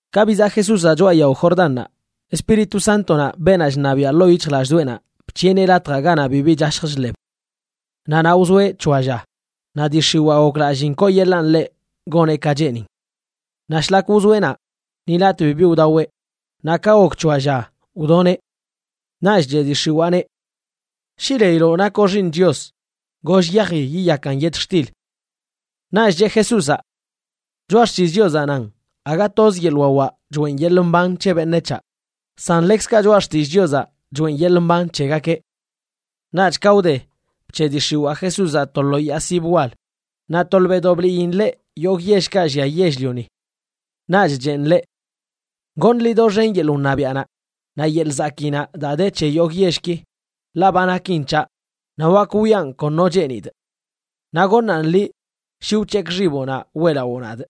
Ka bizaꞌ Jesúzaꞌ choꞌa yao Jordannaꞌ, Espíritu Sántonaꞌ, beenaꞌ chṉabiaꞌ ḻoo yic̱hjlallꞌdoꞌenaꞌ, bc̱hiꞌeneꞌ latjaꞌ ganaꞌ bibi chashj chḻeb. Naꞌ naꞌ wzoeꞌ c̱hoa lla, naꞌ dii x̱iwaa goklalliin kooyeḻaꞌn ḻeꞌ goneꞌ ka cheenin. Naꞌ shlak wzoeꞌ naꞌ ni latꞌ bibi wdaweꞌ, naꞌ ka gok c̱hoa lla, wdoneꞌ. Naꞌch cheꞌ dii x̱iwaaneꞌ: ―Shi leiloꞌ nakoꞌ Xiiṉ Chios, goll yaji yiyakan yetxtil. Naꞌch cheꞌ Jesúzaꞌ: ―Choꞌa Xtillꞌ Chiozaꞌ nan: “Aga toz yeḻꞌ wawaꞌ choeꞌn yeḻꞌ mban c̱he beṉec̱haꞌ, san ḻekzkaꞌ Choꞌa Xtillꞌ Chiozaꞌ choeꞌn yeḻꞌ mban c̱hegakeꞌ.” Naꞌch ka wde, bc̱heꞌ dii x̱iwaa Jesúzaꞌ to lo yaa sib wal, naꞌ tolbeꞌdoꞌ bliin ḻeꞌ yogꞌ yellkaꞌ llia yell-lioni. Naꞌch cheꞌn ḻeꞌ: ―Goṉꞌ liꞌ doxen yeḻꞌ wṉabiaꞌnaꞌ naꞌ yeḻꞌ zakiinaꞌ daa de c̱he yogꞌ yellki, ḻaꞌ ba nakin c̱haꞌ naꞌ wak wiꞌan kon no cheenidꞌ. Naꞌ goṉaꞌn liꞌ shi wc̱hekꞌ xiboꞌnaꞌ weꞌlawoo nadꞌ.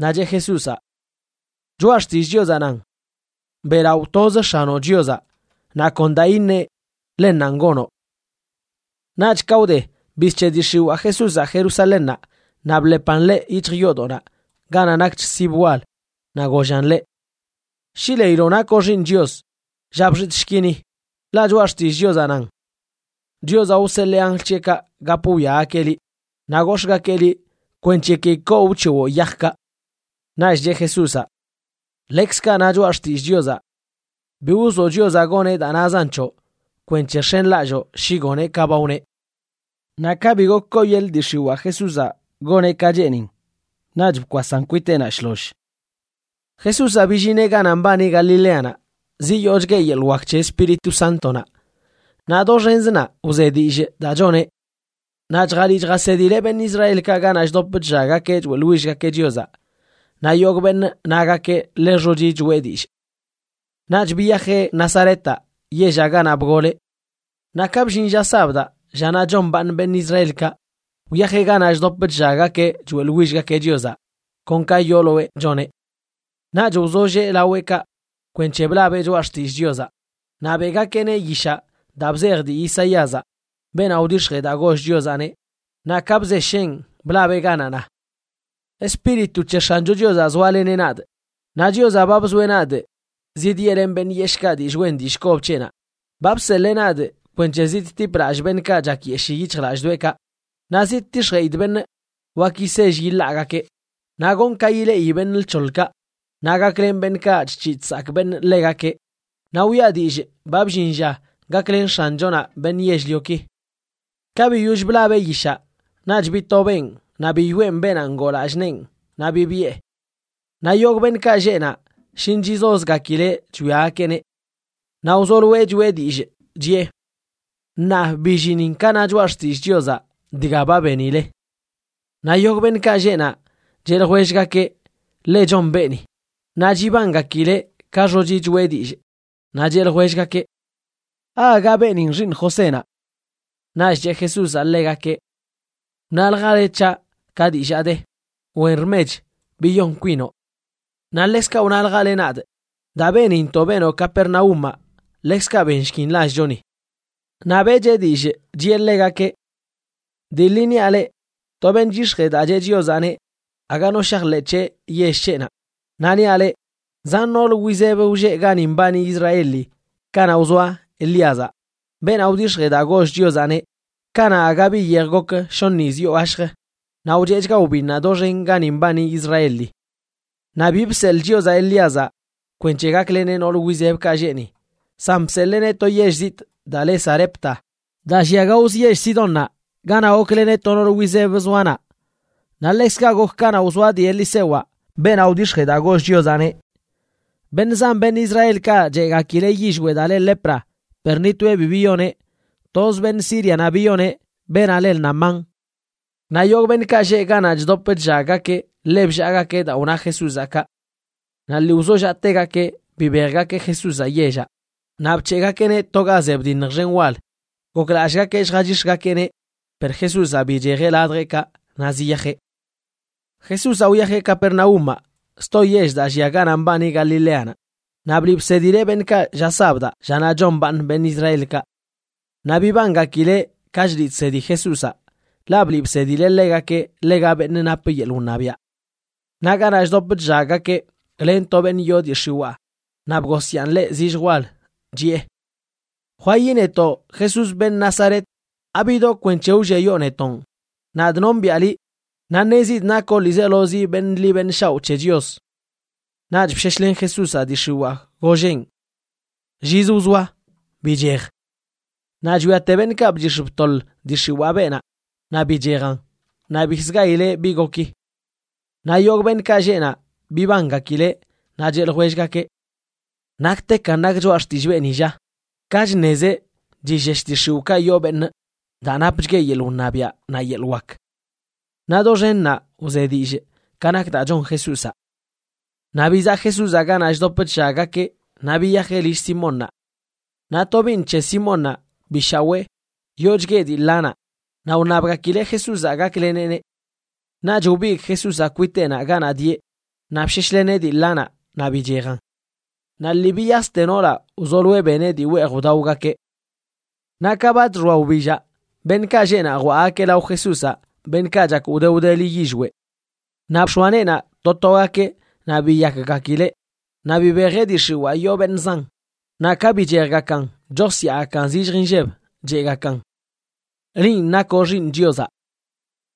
Naꞌ cheꞌ Jesúzaꞌ: ―Choꞌa Xtillꞌ Chiozaꞌ nan: “Beꞌlaꞌo toz X̱anoꞌ Chiozaꞌ naꞌ kon daa iṉeꞌ, ḻennanꞌ gonoꞌ.” Naꞌch ka wde, bizc̱heꞌ dii x̱iwaa Jesúzaꞌ Jerusalénnaꞌ naꞌ bḻepan ḻeꞌ yic̱hj yoodoꞌnaꞌ ganaꞌ nakch sib wal, naꞌ gollan ḻeꞌ: ―Shi leiloꞌ nakoꞌ Xiiṉ Chios, lla bxitꞌshki ni. Ḻaꞌ Choꞌa Xtillꞌ Chiozaꞌ nan: Chiozaꞌ wseḻee anjl c̱heꞌkaꞌ gap wwiagakeꞌ liꞌ, naꞌ gox̱ꞌgakeꞌ liꞌ kwenc̱he ki koo wc̱hewoꞌ yajkaꞌ. Naꞌch cheꞌ Jesúzaꞌ: ―Ḻekzkaꞌ na Choꞌa Xtillꞌ Chiozaꞌ: “Bi wzoꞌ Chiozaꞌ goneꞌ daa nazan c̱hoꞌ kwenc̱he x̱enlalloo shi goneꞌ ka ba wneꞌ.” Naꞌ ka bi gok kooyeḻꞌ dii x̱iwaa Jesúzaꞌ goneꞌ ka cheenin, naꞌch bkwasan kwiteꞌnaꞌ shloll. Jesúzaꞌ billineꞌ ganaꞌ mbani Galileanaꞌ ziyoochgueꞌ yeḻꞌ wak c̱he Espíritu Sántonaꞌ, naꞌ doxenzə naꞌ wze dillꞌ daa choneꞌ. Naꞌ chjaliꞌ chjasedileꞌ beṉꞌ Israelkaꞌ ganaꞌ chdop chllaggakeꞌ choeꞌḻwillgakeꞌ Chiozaꞌ, naꞌ yogꞌ beṉꞌ nagakeꞌ ḻe xochi choꞌe dillꞌ. Naꞌch biyajeꞌ Nazaretaꞌ, yellaꞌ ganaꞌ bgoleꞌ. Naꞌ ka bllin lla sabdaꞌ, llanaꞌ chombaaṉ beṉꞌ Israelkaꞌ, wyajeꞌ ganaꞌ chdop chllaggakeꞌ choeꞌḻwillgakeꞌ Chiozaꞌ kon ka yooloeꞌ choneꞌ. Naꞌch wzollee laweꞌkaꞌ kwenc̱he blabeꞌ Choꞌa Xtillꞌ Chiozaꞌ. Naꞌ beꞌgakeꞌneꞌ yishaꞌ daa bzej dii Isaíazaꞌ, beenaꞌ wdix̱jee daa goll Chiozaꞌneꞌ, naꞌ ka bzesheꞌn blabeꞌ ganaꞌ na: Espíritu c̱he X̱ancho Chiozaꞌ zoaleneꞌ nadꞌ, naꞌ Chiozaꞌ ba bzoeꞌ nadꞌ zidyeꞌlenꞌ beṉꞌ yeshꞌkaꞌ dillꞌ wen dillꞌ kob c̱heꞌnaꞌ. Ba bseḻee nadꞌ kwenc̱he zidtipꞌ lallꞌ beṉꞌkaꞌ chakyeshii yic̱hjlallꞌdoꞌekaꞌ, naꞌ zidtix̱jeꞌidꞌ beṉꞌ wak yisell yiḻaagakeꞌ, naꞌ gonꞌ ka ileꞌi beṉꞌ lc̱hoḻkaꞌ, naꞌ gaklenꞌ beṉꞌkaꞌ chc̱hiꞌ chsakꞌ beṉꞌ ḻegakeꞌ, naꞌ wiꞌa dillꞌ ba bllin lla gaklen X̱anchonaꞌ beṉꞌ yell-lioki. Ka biyoll blabeꞌ yishaꞌ naꞌch bitobeꞌn naꞌ biyoꞌen beenaꞌ ngoo lallꞌ neen, naꞌ bibiꞌe. Naꞌ yogꞌ beṉꞌkaꞌ lleꞌ naꞌ shin chizozgakileꞌ chwiagakeꞌneꞌ. Naꞌ wzoloeꞌ choꞌe dillꞌ, chiꞌe: ―Ṉaa billinin ka na Choꞌa Xtillꞌ Chiozaꞌ dga ba benile. Naꞌ yogꞌ beṉꞌkaꞌ lleꞌ naꞌ cheꞌ ljwellgakeꞌ ḻe chon beeni, naꞌ chibangakileꞌ ka xochi choꞌe dillꞌ. Naꞌ cheꞌ ljwellgakeꞌ: ―¿Aaga beenin xiiṉ Josénaꞌ? Naꞌch cheꞌ Jesúzaꞌ ḻegakeꞌ: ―Wnaljale c̱haꞌ ka dillaa de: “Wen rmech, biyon kwinoꞌ.” Naꞌ ḻekzkaꞌ wnaljale nadꞌ: “Daa benintoꞌ benoꞌ Capernaúmaꞌ ḻekzkaꞌ benshkin lallchoni.” Naꞌ beꞌcheꞌ dillꞌ chiꞌe ḻegakeꞌ: ―Dii ḻi niaꞌ leꞌ, to beṉꞌ chyix̱jee daa cheꞌ Chiozaꞌneꞌ aga no shajḻeꞌ c̱heꞌ yell c̱heꞌnaꞌ. Naꞌ niaꞌ leꞌ, zan nool wizeb wlleꞌ gani mbani Israeli kanaꞌ wzoa Elíazaꞌ, beenaꞌ wdix̱jee daa goll Chiozaꞌneꞌ, kanaꞌ aga bi yej gok shoṉ yiz yoo gashjə naꞌ wcheꞌchga wbinnaꞌ doxen gani mbani Israeli. Naꞌ bi bseḻꞌ Chiozaꞌ Elíazaꞌ kwenc̱he gakleneꞌ nool wizebkaꞌ lleꞌ ni, san bseḻeeneꞌ to yell zitꞌ daa le Sarepta, daa llia gaozə yell Sidónnaꞌ, ganaꞌ gokleneꞌ to nool wizeb zoa naꞌ. Naꞌ ḻekzkaꞌ gok kanaꞌ wzoa dii Elisewaꞌ, beenaꞌ wdix̱jee daa goll Chiozaꞌneꞌ. Beṉꞌ zan beṉꞌ Israelkaꞌ cheꞌgakileꞌ yillweꞌ daa le lepra, per ni toeꞌ bi biyoneꞌ. Toz beṉꞌ Sírianaꞌ biyoneꞌ, beenaꞌ le Naamán. Naꞌ yogꞌ beṉꞌkaꞌ lleꞌ ganaꞌ chdop chllaggakeꞌ ḻe bllaagakeꞌ daa wna Jesúzaꞌ kaꞌ. Naꞌ lii wzollaꞌtegakeꞌ bibejgakeꞌ Jesúzaꞌ yellaꞌ, naꞌ bc̱heꞌgakeꞌneꞌ to ga ze bdiṉj xen wal, goklallꞌgakeꞌ lljachix̱gakeꞌneꞌ. Per Jesúzaꞌ bichejeꞌ ladjeꞌkaꞌ naꞌ ziyajeꞌ. Jesúzaꞌ wyajeꞌ Capernaúmaꞌ, sto yell daa llia ganaꞌ mbani Galileanaꞌ, naꞌ bliꞌ bsedileꞌ beṉꞌkaꞌ lla sabdaꞌ, llanaꞌ chombaaṉ beṉꞌ Israelkaꞌ. Naꞌ bibangakileꞌ ka chliꞌ chsedi Jesúzaꞌ, ḻaꞌ bliꞌ bsedileꞌ ḻegakeꞌ ḻega beṉꞌ nap yeḻꞌ wṉabiaꞌ. Naꞌ ganaꞌ chdop chllaggakeꞌ, len to beṉꞌ yoo dii x̱iwaa naꞌ bgosyaan ḻeꞌ zillj wal, chiꞌe: ―¡Jwayi netoꞌ, Jesús, beṉꞌ Nazaret! ¿Abidoꞌ kwenc̱he wlliayoo netonꞌ? Nadꞌ nombiꞌa liꞌ, naꞌ ṉezidꞌ nakoꞌ ḻiizelozi beṉꞌ ḻi beṉꞌ shaoꞌ c̱he Chios. Naꞌch bsheshlen Jesúzaꞌ dii x̱iwaa, golleꞌn: ―¡Llizə wzoa! ¡Bichej! Naꞌ chwiate beṉꞌkaꞌ bchix̱ btoḻ dii x̱iwaa beenaꞌ, naꞌ bichejan naꞌ bikzə gayileꞌ bi goki. Naꞌ yogꞌ beṉꞌkaꞌ lleꞌ naꞌ bibangakileꞌ, naꞌ cheꞌ ljwellgakeꞌ: ―¿Naktekan nak choꞌa xtillꞌ beeni, lla? Ka chṉezeꞌ chillesh dii x̱iwꞌkaꞌ yoo beṉꞌ daa napchgueꞌ yeḻꞌ wṉabiaꞌ naꞌ yeḻꞌ wak. Naꞌ doxen naꞌ wze dillꞌ ka nak daa chon Jesúzaꞌ. Naꞌ bizaꞌ Jesúzaꞌ ganaꞌ chdop chllaggakeꞌ naꞌ biyajeꞌ lill Simónnaꞌ. Naꞌ tobiiṉ c̱he Simónnaꞌ bi shawee, yoochgueꞌ dii ḻanaꞌ, naꞌ wṉabgakileꞌ Jesúzaꞌ gakleneꞌneꞌ. Naꞌch wbigꞌ Jesúzaꞌ kwiteꞌnaꞌ ganaꞌ dieꞌ naꞌ bsheshleneꞌ dii ḻanaꞌ naꞌ bichejan. Naꞌ lii biyaste noolaꞌ wzoloeꞌ beneꞌ dii weej wdaogakeꞌ. Naꞌ ka ba chxoa wbillaꞌ, beṉꞌkaꞌ lleꞌ naꞌ jwaꞌgakeꞌ lao Jesúzaꞌ beṉꞌkaꞌ chak wde wdeli yillweꞌ. Naꞌ bx̱oa neenaꞌ to togakeꞌ naꞌ biyakgakileꞌ. Naꞌ bibejeꞌ dii x̱iwaa yoo beṉꞌ zan, naꞌ ka bichejgakan chosyaagakan zillj inlleb, cheꞌgakan: ―Linꞌ nakoꞌ Xiiṉ Chiozaꞌ.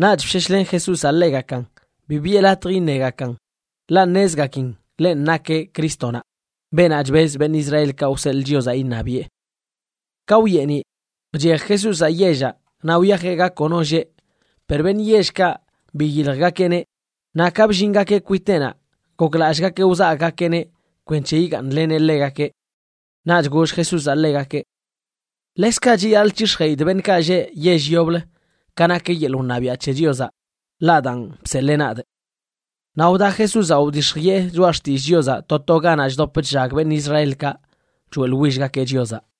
Naꞌch bsheshlen Jesúzaꞌ ḻegakan. Bi biꞌe latj iṉegakan ḻaꞌ ṉezgakin ḻenꞌ nakeꞌ Crístonaꞌ, beenaꞌ chbez beṉꞌ Israelkaꞌ wseḻꞌ Chiozaꞌ iṉabiꞌe. Ka wyeeniꞌ, bchej Jesúzaꞌ yellaꞌ naꞌ wyajeꞌ ga kono lleꞌ. Per beṉꞌ yellkaꞌ biyiljgakeꞌneꞌ, naꞌ ka bllingakeꞌ kwiteꞌnaꞌ, goklallꞌgakeꞌ wzagꞌgakeꞌneꞌ kwenc̱he yigaaṉleneꞌ ḻegakeꞌ. Naꞌch goll Jesúzaꞌ ḻegakeꞌ: ―Ḻekzkaꞌ chiyaḻꞌ c̱hix̱jeꞌidꞌ beṉꞌkaꞌ lleꞌ yell yoblə ka nak yeḻꞌ wṉabiaꞌ c̱he Chiozaꞌ, ḻaꞌ daan bseḻee nadꞌ. Naꞌ wda Jesúzaꞌ wdix̱jiꞌe choꞌa xtillꞌ Chiozaꞌ to to ganaꞌ chdop chllag beṉꞌ Israelkaꞌ choeꞌḻwillgakeꞌ Chiozaꞌ.